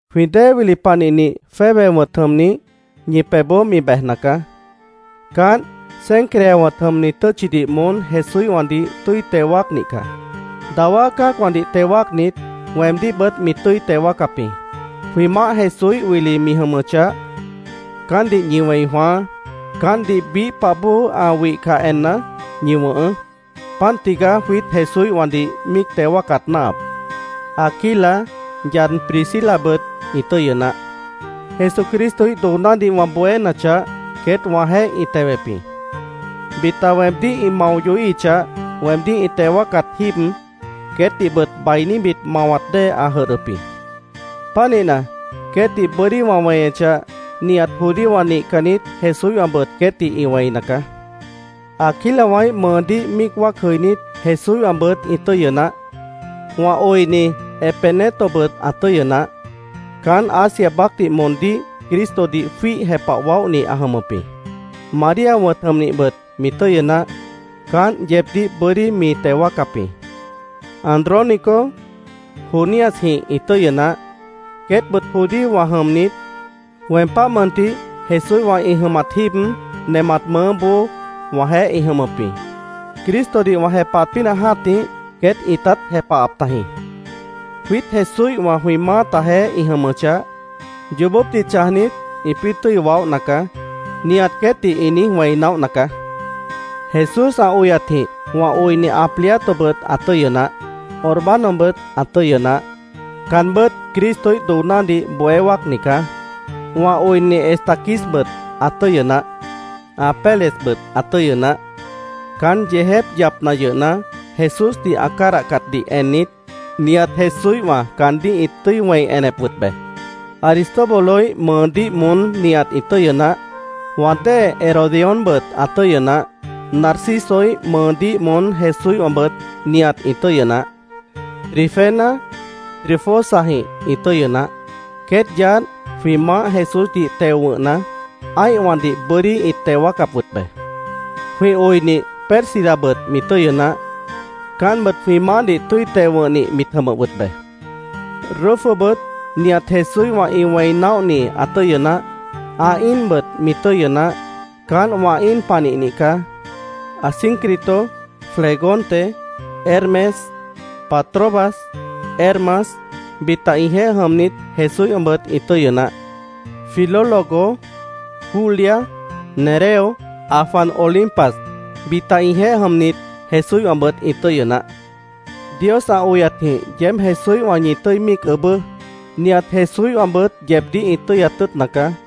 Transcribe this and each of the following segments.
Jwĩ dée wili panihnih Febe wʉ̃t jʉmnih ñi pebhboó mi bejna caá. Caánt Cencrea wʉ̃t jʉmni tʉ́tchidih moón Jesúíhwãdih tʉ́i teo wáacnih caá. Dawá cã́acwãdih teo wáacnit, weemdíhbʉt mi tʉ́i teo wáacap jĩ. Jwĩ Maáh Jesúíh wili mi jʉmʉchah, caántdih ñi wẽi jwãáá. Caántdih biíh pah bóo ã wihcah enna, ñi wʉ̃hʉʉ́. Páant tigaá jwiít Jesúíhwãdih míic teo wáacat náahap. Aquila, yad Priscilabʉt ĩ tʉ́yʉ naáh. Jesucristoíh doonádih wã bohénachah, queét wãjeéh ĩ tewep jĩ. Bita weemdíh ĩ mao yohíhichah, weemdíh ĩ teo wáacat jíib queétdihbʉt bainíbit mawat dée ã jʉdhdʉp jĩ. Pánihna, queétdih bʉ́dí wã weñechah, nihat judíowã nihcannit Jesúíhwãbʉt queétdih ĩ wẽina caá. Aquilawãíh mʉʉdíh míic wáac jʉinít Jesúíhwãbʉt ĩ tʉ́yʉ naáh. Wã oini Epenetobʉt ã tʉ́yʉ naáh. Caán Asia baácdih moondíh Cristodih jwíih jepah waóhni ã jʉmʉp jĩ. María wʉ̃t jʉmnihbʉt mi tʉ́yʉ naáh. Caánt yeebdíh bʉ́dí mi teo wáacap jĩ. Andrónico, Juniasjĩh ĩ tʉ́yʉ naáh. Queétbʉt judíowã jʉmnit, weem páh mʉntih Jesúíhwã ĩ jʉmat jíib, nemat mʉʉ́boó wãjeéh ĩ jʉmʉp jĩ. Cristodih wã jepahat pínah jã́tih queét ĩtát jepahap tajĩ. Jwiít Jesúíhwã jwĩ maátajeéh ĩ jʉmʉchah, “Yoobópdih chãjnit, ĩpĩ́ tʉ́i waóhna caá”, nihat queétdih ĩ niíj wẽi naóhna caá. Jesús ã oyatjĩh wã oini Ampliatobʉt ã tʉ́yʉ naáh. Urbanobʉt ã tʉ́yʉ naáh. Caanbʉ́t Cristoíh doonádih bohé wáacni caá. Wã oini Estaquisbʉt ã tʉ́yʉ naáh. Apelesbʉt ã tʉ́yʉ naáh. Caán yeejép yapna yʉhna, Jesúsdih ã cádahcatdih ennit, nihat Jesúíhwã caandíh ĩt tʉ́i wẽi enep wʉt be. Aristóbuloíh mʉʉdíh moón nihat ĩ tʉ́yʉ naáh. Wã dée Herodiónbʉt ã tʉ́yʉ naáh. Narcisoíh mʉʉdíh moón Jesúíhwãbʉt nihat ĩ tʉ́yʉ naáh. Trifena, Trifosajĩh ĩ tʉ́yʉ naáh. Queét yaádh jwĩ Maáh Jesúsdih teo wʉ̃hna, ã́ihwãdih bʉ́dí ĩt teo wáacap wʉt be. Jwĩ oinih Pérsidabʉt mi tʉ́yʉ naáh. Caántbʉt jwĩ maáhdih tʉ́i teo wʉ̃hnih mit jʉmʉp wʉt be. Rufobʉt nihat Jesúíhwã ĩ wẽi naóhni ã tʉ́yʉ naáh. Ã íinbʉt mi tʉ́yʉ naáh. Caánt wã íin panihnih caá. Asíncrito, Flegonte, Hermes, Patrobas, Hermas, bita ĩjeéh jʉmnit Jesúíhwãbʉt ĩ tʉ́yʉ naáh. Filólogo, Julia, Nereo, ã jwan Olimpas, bita ĩjeéh jʉmnit Jesúíhwãbʉt ĩ tʉ́yʉ naáh. Dios ã oyatjĩh yeéb Jesúíhwã ñi tʉ́i míic ʉʉ́bʉ́. Nihat Jesúíhwãbʉt yeebdíh ĩ tʉ́yat tʉ́ʉtna caá.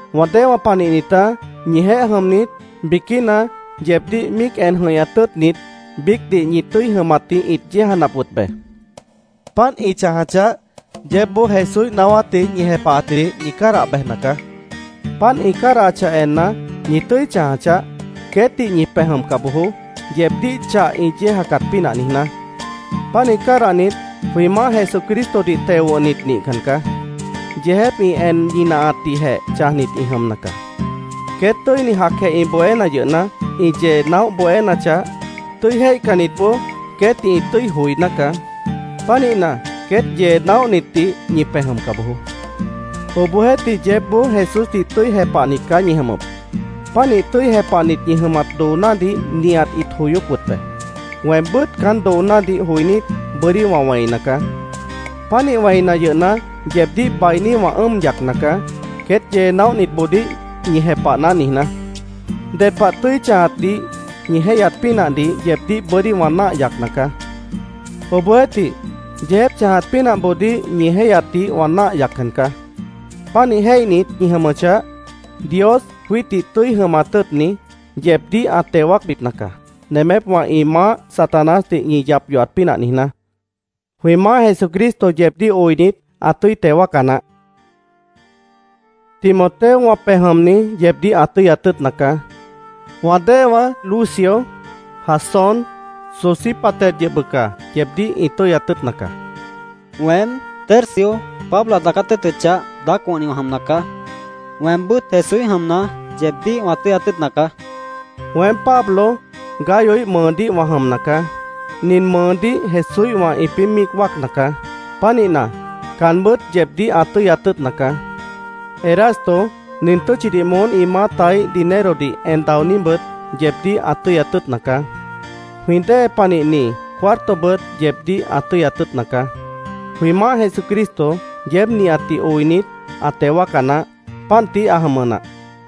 Wã déewã panihnitá, ñijeéh jʉmnit biquína yeebdíh míic en jʉ̃ihñat tʉ́ʉtnit, biícdih ñi tʉ́i jʉmatdih ĩt yéejanap wʉt be. Páant ĩ chãjachah, yeébboó Jesúíh naáwátdih ñi jepahatjidih ñi cádah bejna caá. Páant ĩ cádahachah enna, ¡ñi tʉ́i chãja chaáh! Queétdih ñi pej jʉmca bojoó, yeebdíh chah ĩ yéejacat pínah niijná. Pánih cádahnit jwĩ Maáh Jesucristodih teo wʉ̃hnit nihcan caá. Yeejép ĩ en ñinahatdihjeh chãjnit ĩ jʉmna caá. Queét tʉ́ini jacjeh ĩ bohéna yʉhna, ĩ yee naóh bohénachah, tʉ́i jéihcannitboó queétdih ĩ tʉ́i joiná caá. Pánihna, queét yee naóhnitdih ñi pej jʉmca bojoó. Obohjeéhtih, yeébboó Jesúsdih tʉ́i jepahnit caá ñi jʉmʉp. Pánih tʉ́i jepahnit ñi jʉmat doonádih nihat ĩt joyóp wʉt be. Weembʉ́t caán doonádih joinít, bʉ́dí wã wẽina caá. Pánih wẽina yʉhna, yeebdíh bainí wã ʉ́ʉm yacna caá, “queét yee naóhnitboodíh ñi jepahná”, niijná. Ded pah tʉ́i chãjatdih ñi jéihyat pínahdih yeebdíh bʉ́dí wã náah yacna caá. Obohjeéhtih, yeejép chãjat pínahboodíh ñi jéihyatdih wã náah yaccan caá. Pánih jéihnit ñi jʉmʉchah, Dios, jwiítdih tʉ́i jʉmat tʉ́ʉtni, yeebdíh ã teo wáacbipna caá, nemépwã ĩ maáh Satanásdih ñi yap yohat pínah niijná. Jwĩ Maáh Jesucristo yeebdíh oinit, ã tʉ́i teo wáaca naáh. Timoteo, wã pej jʉmni, yeebdíh ã tʉ́yat tʉ́ʉtna caá. Wã déewã Lucio, Jasón, Sosípater yʉh bʉca yeebdíh ĩ tʉ́yat tʉ́ʉtna caá. Weém, Tercio, Pablo ã daacát tʉ́ʉtʉchah, daác wʉ̃hni wã jʉmna caá. Weembʉ́t Jesúíh jʉmna, yeebdíh wã tʉ́yat tʉ́ʉtna caá. Weém Pablo, Gayoíh mʉʉdíh wã jʉmna caá. Nin mʉʉdíh Jesúíhwã ĩpĩ́ míic wáacna caá. Pánihna, caanbʉ́t yeebdíh ã tʉ́yat tʉ́ʉtna caá. Erasto, nin tʉ́tchidih moón ĩ maátaíh dinerodih en daoníbʉt yeebdíh ã tʉ́yat tʉ́ʉtna caá. Jwĩ dée panihni Cuartobʉt yeebdíh ã tʉ́yat tʉ́ʉtna caá. Jwĩ Maáh Jesucristo yeéb nihatdih oinit, ã teo wáaca naáh. Páant tií ã jʉmʉ nah.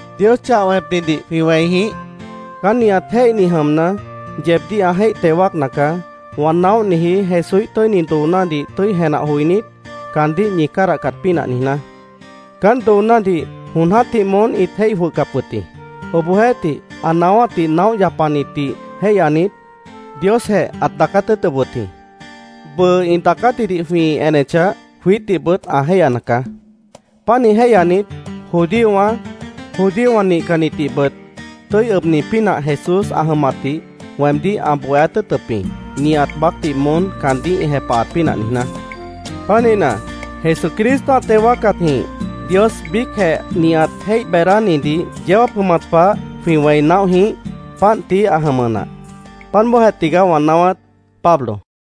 ¡Dios, chah wẽpnidih jwĩ wẽi jĩíh! Caán nihat jéihni jʉmna, yeebdíh ã jéih teo wáacna caá, wã naóhniji Jesúíh tʉ́ini doonádih tʉ́i jenah joinít, caandíh ñi cádahcat pínah niijná. Caán doonádih jon jã́tih moón ĩt jéih jwʉhcap wʉt jĩ. Obohjeéhtih, ã naáwátdih naóh yapanitdih jéihyanit, Diosjeh ãt daacát tʉ́ʉtʉp wʉt jĩ. Bʉʉ ĩ daacátjidih jwĩ enechah, jwiítdihbʉt ã jéihyana caá. Pánih jéihyanit, judíowã, judíowã nihcannitdihbʉt tʉ́i ʉbni pínah Jesús ã jʉmatdih weemdíh ã bohéát tʉ́ʉtʉp jĩ, nihat baácdih moón caandíh ĩ jepahat pínah niijná. Pánihna, ¡Jesucristo ã teo wáacatjĩh, Dios biícjeh nihat jéih beedánidih yeó jáap jʉmat pah jwĩ wẽi naóh jĩíh! Páant tií ã jʉmʉ nah. Páant bóojeh tigaá wã naáwát. Pablo